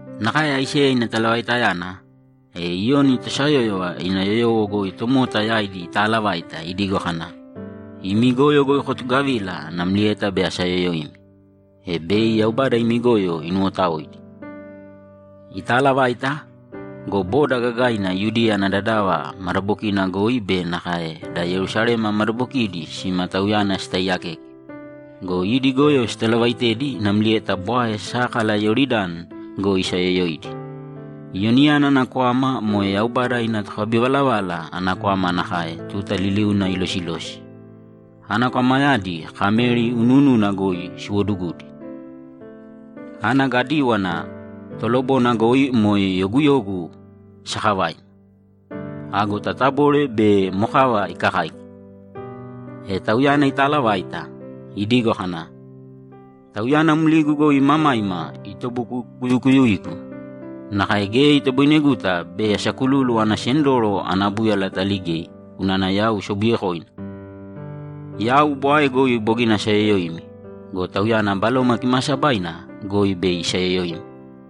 Nakae Aiseya ina talavaitayana, e Iyoni tosayóyova ina yoyowo goi tomota yaidi itaalavaita idigo kana, ‘Imi goyo goi kotugavīla namlieta bei asayoyoimi, e bei Yaubada imi goyo inuwotaoidi.’ Itaalavaita go, boda gagaina Yudiya ana dadava madabokina goi be nakae da Yerusalema madabokidi sima tauyana sitaiyakeke go, idi goyo sitalavaitedi namlieta bwae sákala Iyoridani goi isayoyoidi. Iyoniyana ana kwama moe Yaubada ina tokabivalavala ana kwama nakae tuta liliuna ilosilosi. Ana kwamayadi kameri unuununa goi siwodugudi. Ana gadíwana tolobona goi moe yoguyogu sakavaina. Ago tatabole be mokava ikakáika. E tauyana itaalavaita, idigo kana, ‘Tauyana mligu goi imamaima itobukukuyuigu; nakae geya itoboineguta bei asakululu ana sendoro ana búyala ataligei unana yau sobuyekoina. Yau bwae goi bogina asayoyoimi go, Tauyana Baloma Kimaasabaina goi bei isayoyoimi.’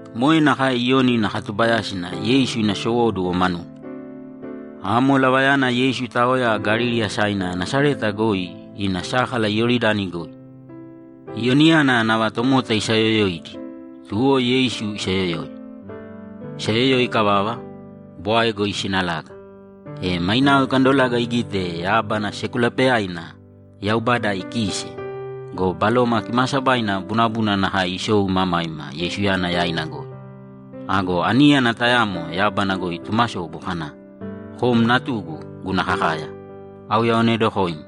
Moe nakae Iyoni ina katubayásina Yeisu ina sowóduwo manuna. Amo lavayana Yeisu itaoya Galili asaina Nasareta goi ina sákala Iyoridani goi. Iyoniyana nava tomota isaayoyoidi, tuwo Yeisu isayoyoi. Isayoyoi ikavava, bwae goi isinalaga, e mainao ikandolaga igite yábana sekulapeyaina Yaubada ikiise go, Baloma Kimaasabaina bunabuna nakae isou imamaima Yeisuyana yaina goi. Ago aníyana tayamo yábana goi itumasobu kana, ‘Kom Natugu guna kakaya, auyaonedokoim.’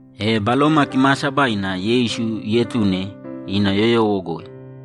E Baloma Kimaasabaina Yeisu ietune ina yoyowo goi.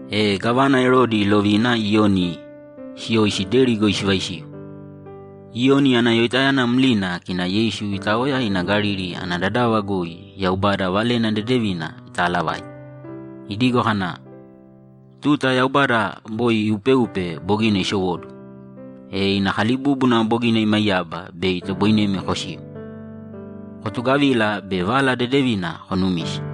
E gávana Erodi ilovina Iyoni siyoisi deri goi sivaisiu. Iyoni ana yoitayana mlina kina Yeisu itaoya ina Galili ana dadava goi Yaubada Valena Dedevina itaalavaite, idigo kana, ‘Tuta Yaubada boi iupeupe bogina isowóduwo, e ina kalibúbuna bogina imaiyaba bei itoboinemi kosiu. Kotugavīla be Vala Dedevina konumīse.’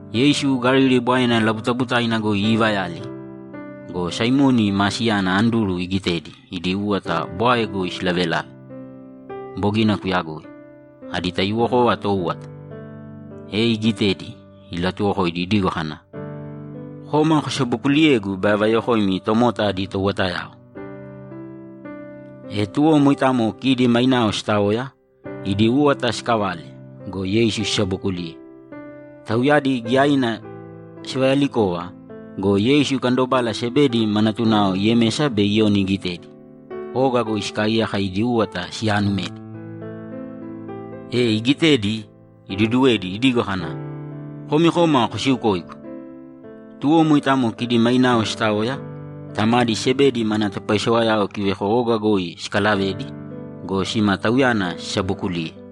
Yeisu Galili Bwaena labutabutaina goi iivayali go, Saimoni maa siyana Anduru igitedi idi úwata bwae goi silavelave. Bogina kuyagoi. Adi taiyuwokova tóuwata. E igitedi, ilatuwokoidi idigo kana, ‘Kōma kosabokuliyēgu bei avayokoimi tomota adi touwatayao.’ E tuwo moitamo kidi mainao sitaoya, idi úwata sikalave go, Yeisu sisabokuliye. Tauyadi giyaina sivayalikova go, Yeisu ikandobala Sebedi ma natunao Yemesa be Iyoni igitedi, oga goi sikaaiyaka idi úwata siyaanumedi. E igitedi, iduduwedi idigo kana, ‘Komi kōma kosiukōigu.’ Tuwo moitamo kidi mainao sitaoya, tamadi Sebedi mana topaisewayao kiveko oga goi sikalavedi go, sima Tauyana sisabokuliye.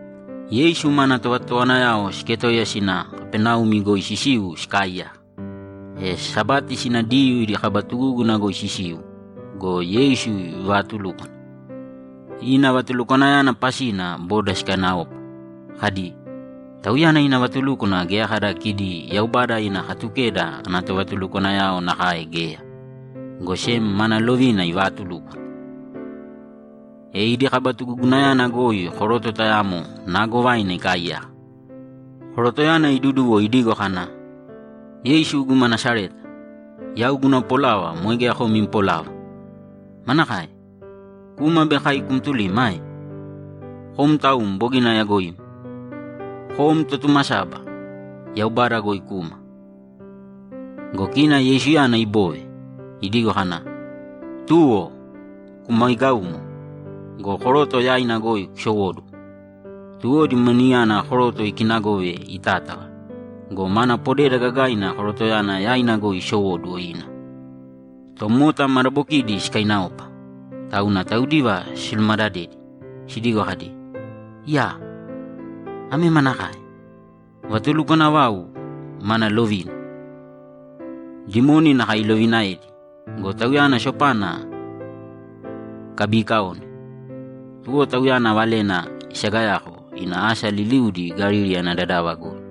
Yeisu mana tovatotowanayao siketoiya sina Kapaneumi goi sisiu sikaaiyaka. E Sabati sina Diyuu idi kaba tugúguna goi sisiu go, Yeisu ivaatulúkwana. Ina vatulukwanayana pasina boda sikainaopa, kadi, ‘Tauyana ina vatulúkwana geya kada kidi Yaubada ina Katukeda ana tovatulukwanayao nakae geya, go sem mana lovina ivaatulúkwana.’ E idi kaba tugugunayana goi koroto tayamo naagovaina ikaaiyaka. Korotoyana iduduwo idigo kana, ‘Yeisu guma Nasareta, yau guna polava moe geya kom im polava. Manakae? Kuma bei kai kumtulima ae? Kom taum bogina ayagoim. Kom Totumasaba, Yaubada goi kuma.’ Go kina Yeisuyana ibove, idigo kana, ‘Tuwo! Kumaigāumo go, koroto yaina goi kusowōduwo!’ Tuwo dimoniyana koroto ikinagove itátava go, mana podeda gagaina korotoyana yaina goi isowóduwo ina. Tomota madabokidi sikainaopa, tauna taudiva silumadadedi, sidigo kadi, ‘Iyaa, ame manakae? Vatulukwana vau mana lovina! Dimoni nakae ilovinaedi go, Tauyana sopana sikabiikaone!’ Tuwo Tauyana valena isagayako ina asa liliudi Galili ana dadava goi.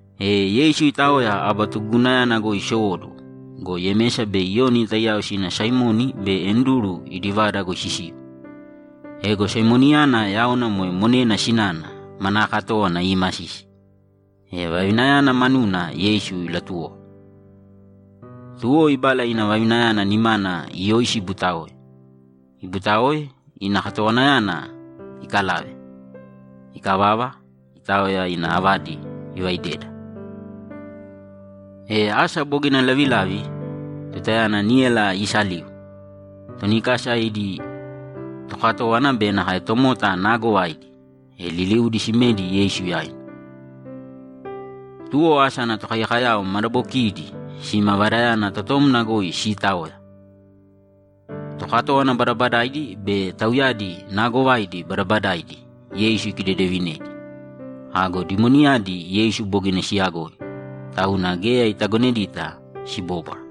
E Yeisu itaoya aba tugugunayana goi isowóduwo go, Yemesa be Iyoni taiyao sina Saimoni be Anduru idi vada goi sisiu. Ego Saimoniyana yaona (moe monena sinana) manaa katówana iimasisi. E vavinayana manuna Yeisu silatuwoko. Tuwo ibala ina vavinayana nimana iyoisi ibutaoe. Ibutaoe, ina katowanayana ikalave. Ikavava, itaoya ina avadi ivaideda. E asa bogina lavilavi, tutayana níyala iisaliu, toni kasa idi tokatówana be nakae tomota naagovaidi, e liliudi simedi Yeisu yaina. Tuwo asa ana tokaiyakayao madabokiidi sima vadayana totomna goi siitaoya. Tokatówana badabadaidi be tauyadi naagovaidi badabadaidi Yeisu ikidedevinedi. Ago dimoniyadi Yeisu bogina siyagoi, tauna geya itagonedita sibóbwara.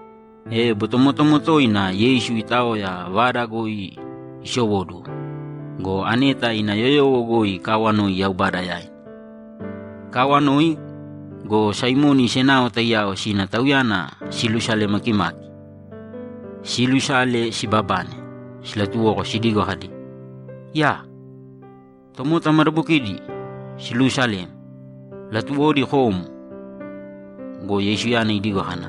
E botomotomo toina Yeisu itaoya vada goi isowóduwo go, aneta ina yoyowo goi ikaawanoi Yaubada yaina. Ikaawanoi go, Saimoni senao taiyao sina Tauyana silusale makimaki. Silusale, sibabane, silatuwoko sidigo kadi, ‘Iyaa! Tomota madabokidi siluusalem, latuwodi kom.’ Go Yeisuyana idigo kana,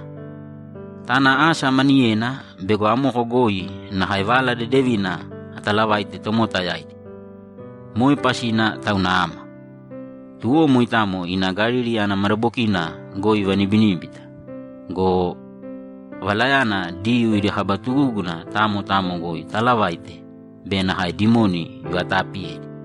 ‘Tāna asa maniyena bego amoko goi nakae Vala Dedevina atalavaite tomota yaidi. Moe pasina tauna ama.’ Tuwo moitamo ina Galili ana madabokina goi ivanibiníbita go, Valayana Diyuu idi kaba tugúguna tamo tamo goi itaalavaite be nakae dimoni ivataapiyedi.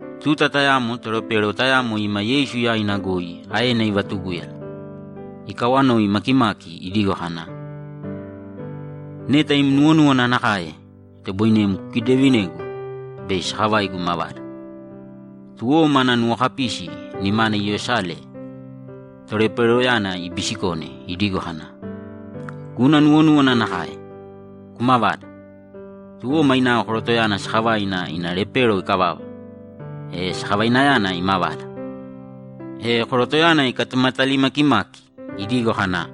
Tuta tayamo tolepero tayamo ima Yeisu yaina goi aena ivatugúyala, ikawanoi makimaki idigo kana, ‘Neta im nuwonúwana nakae, itoboinem kukidedevinegu bei sakavaigu imavada.’ Tuwo mana nuwokapisi nimana iyosale toleperoyana ibisikone idigo kana, ‘Guna nuwonúwana nakae. Kumavāda!’ Tuwo mainao korotoyana sakavaina ina lepero ikavava, e sakavainayana imavada. E korotoyana ikatumatali makimaki idigo kana,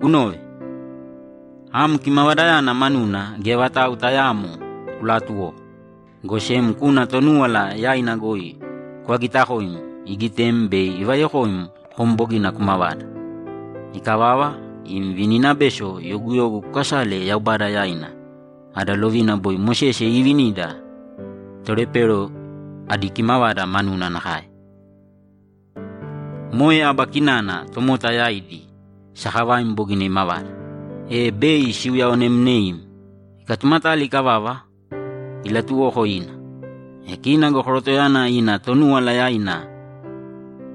‘Kunōve! Am kimavadayana manuna geya vatau tayaamo kulaatuwōko, go sem kūna Tonúwala yaina goi kuvagitakōim igitem bei ivayokoim kom bogina kumavada. Ikavava, im vininabeso yoguyogu kukasāle Yaubada yaina ada lovina boi Mosese iivinida tolepero adi kimavada manuna nakae. Moe aba kinana tomota yaidi sakavaim bogina imavada, e bei siuyaonemneim.’ Ikatumatali ikavava, ilatuwoko ina. E kina go korotoyana ina Tonúwala yaina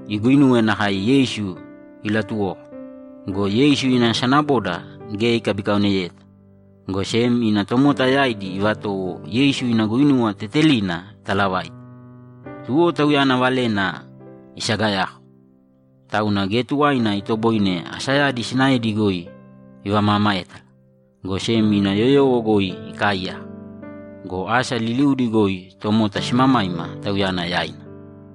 iguinuwe nakae Yeisu ilatuwoko go, Yeisu ina sanaboda geya ikabikaoneyeta, go sem ina tomota yaidi ivatowo Yeisu ina guinuwa tetelina italavaite. Tuwo Tauyana valena isagayako. Tauna geya tuwaina itoboine asayadi sinaedi goi ivamaamaétala, go sem ina yoyowo goi ikaaiyaka. Go asa liliudi goi tomota simamaima Tauyana yaina.